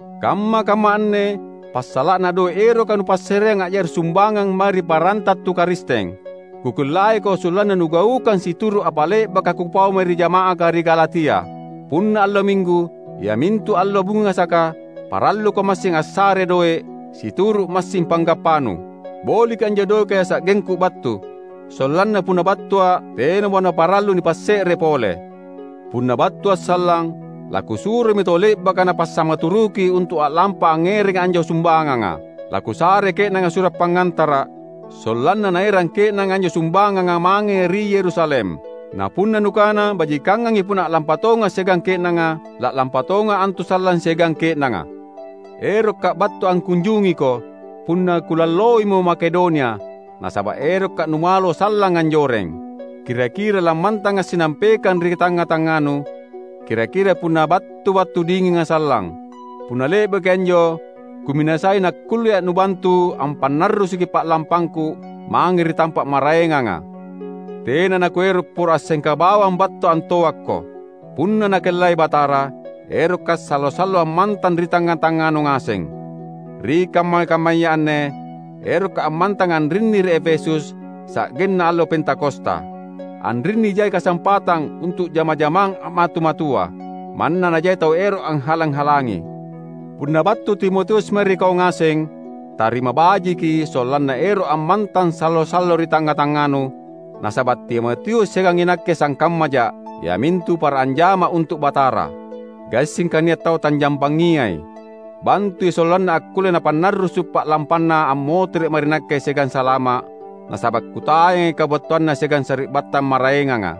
Kamma-kamma anne passala’na doe’ eroka nupassareang a’jari sumbangang mae ri paranta tu Karisteng; kukellaiko sollanna nugaukang situru’ apa le’baka kupau mae ri jama’aka ri Galatia. Punna allo Minggu, iamintu allo bungasaka, paralluko massing assare doe’, situru’ massing panggappanu. Boliki anjo doeka sa’gengku battu, sollanna punna battua’, tenamo naparallu nipasse’re pole. Punna battua’ sallang, lakusuromi tau le’baka nupassamaturuki untu’ a’lampa angngerangi anjo sumbanganga. Lakusarei ke’nanga sura’ pangngantara’, sollanna naerang ke’nanga anjo sumbanganga mange ri Yerusalem. Na punna nukana bajikangangi punna a’lampa tonga’ siagang ke’nanga, la’lampa tonga’ antu sallang siagang ke’nanga. Erokka’ battu angkunjungiko punna kulalloimo Makedonia, nasaba’ erokka’ numalo sallang anjoreng. Kira-kira lammantanga’ sinampekang ri tangnga-tangnganu, kira-kira punna battu wattu dinginga sallang. Punna le’baki anjo kuminasai nakkullea’ nubantu ampannarrusuki pa’lampangku mange ri tampa’ maraenganga. Tena nakuero’ poro assengka bawang battu antoakko. Punna Nakellai Batara, erokka’ sallo-sallo ammantang ri tangnga-tangnganu ngaseng. Ri kamma-kammaya anne, erokka’ ammantang anrinni ri Efesus, sa’genna allo Pentakosta. Anrinni jai kasampatang untu’ jama-jamang a’matu-matua, manna najai tau ero’ anghalang-halangi. Punna battu Timotius mae ri kau ngaseng, tarima bajiki sollanna ero’ ammantang sallo-sallo ri tangnga-tangnganu; nasaba’ Timotius siagang inakke sangkammaja’, iamintu para anjama’ untu’ Batara. Gassingka nia’ tau tanjampangiai. Bantui sollanna akkulle napannarrusu’ pa’lampanna ammotere’ mae ri nakke siagang salama’; nasaba’ kutayangi kabattuanna siagang sari’battang maraenganga.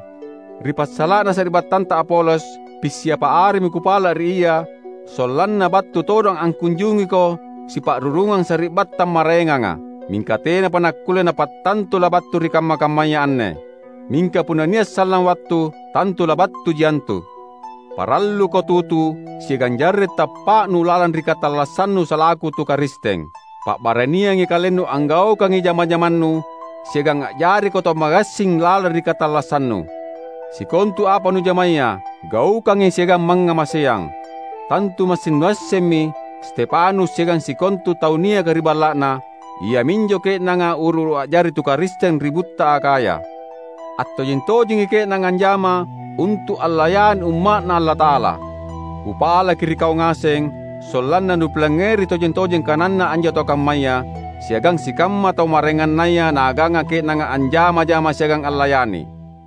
Ri passala’na sari’battanta Apolos, pissiapa aremi kupala’ ri ia sollanna battu todong angkunjungiko sipa’rurungang sari’battang maraenganga. Mingka tenapa nakkulle napattantu labattu ri kamma-kammaya anne. Mingka punna nia’ sallang wattu, tantu labattuji antu. Paralluko tutu siagang jarre’ tappa’nu lalang ri katallassannu salaku tu Karisteng. Pa’baraniangi kalennu anggaukangi jama-jamannu siagang a’jariko tau magassing lalang ri katallassannu. Sikontu apa nujamaya, gaukangi siagang mangngamaseang. Tantu massing nuassemmi Stefanus siagang sikontu tau niaka ri balla’na; iaminjo ke’nanga uru-uru a’jari tu Karisteng ri butta Akhaya. Attojeng-tojengi ke’nanga anjama untu’ allayani umma’Na Allata’ala. Kupalaki ri kau ngaseng sollanna nupilangngeri tojeng-tojeng kananna anjo tau kammaya, siagang sikamma tau maraengannaya naaganga ke’nanga anjama-jama siagang allayani.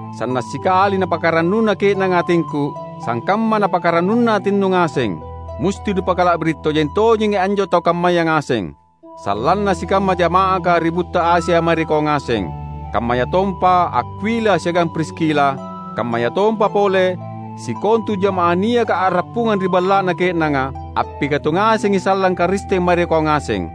Sanna’ sikali napakarannuna ke’nanga atingku, sangkamma napakarannuna atinnu ngaseng. Musti nupakala’biri’ tojeng-tojengi anjo tau kammaya ngaseng. Sallanna sikamma jama’aka ri butta Asia mae ri kau ngaseng. Kammayatompa Akwila siagang Priskila, kammayatompa pole sikontu jamaah niaka a’rappungang ri balla’na ke’nanga, appikatu ngasengi sallang Karisteng mae ri kau ngaseng.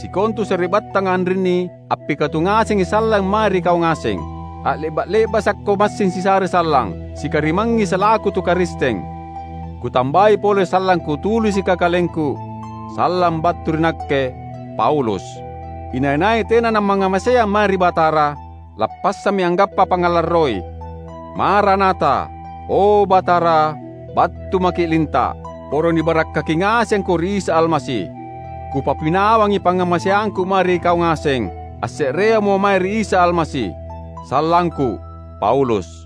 Sikontu sari’battanga anrinni appikatu ngasengi sallang mae ri kau ngaseng. A’le’ba’-le’basakko massing sisare sallang, sikarimangngi salaku tu Karisteng. Kutambai pole sallang kutulisika kalengku: Sallang battu ri nakke, Paulus. Inai-nai tena namangngamaseang mae ri Batara, lappassammi anggappa pangngalarroi! Maranatha — O, Batara, battu maKi’ linta’! Poro nibarakkaki ngasengko ri Isa Almasi. Kupapinawangi pangngamaseangku mae ri kau ngaseng, asse’reamo mae ri Isa Almasi. Sallangku, Paulus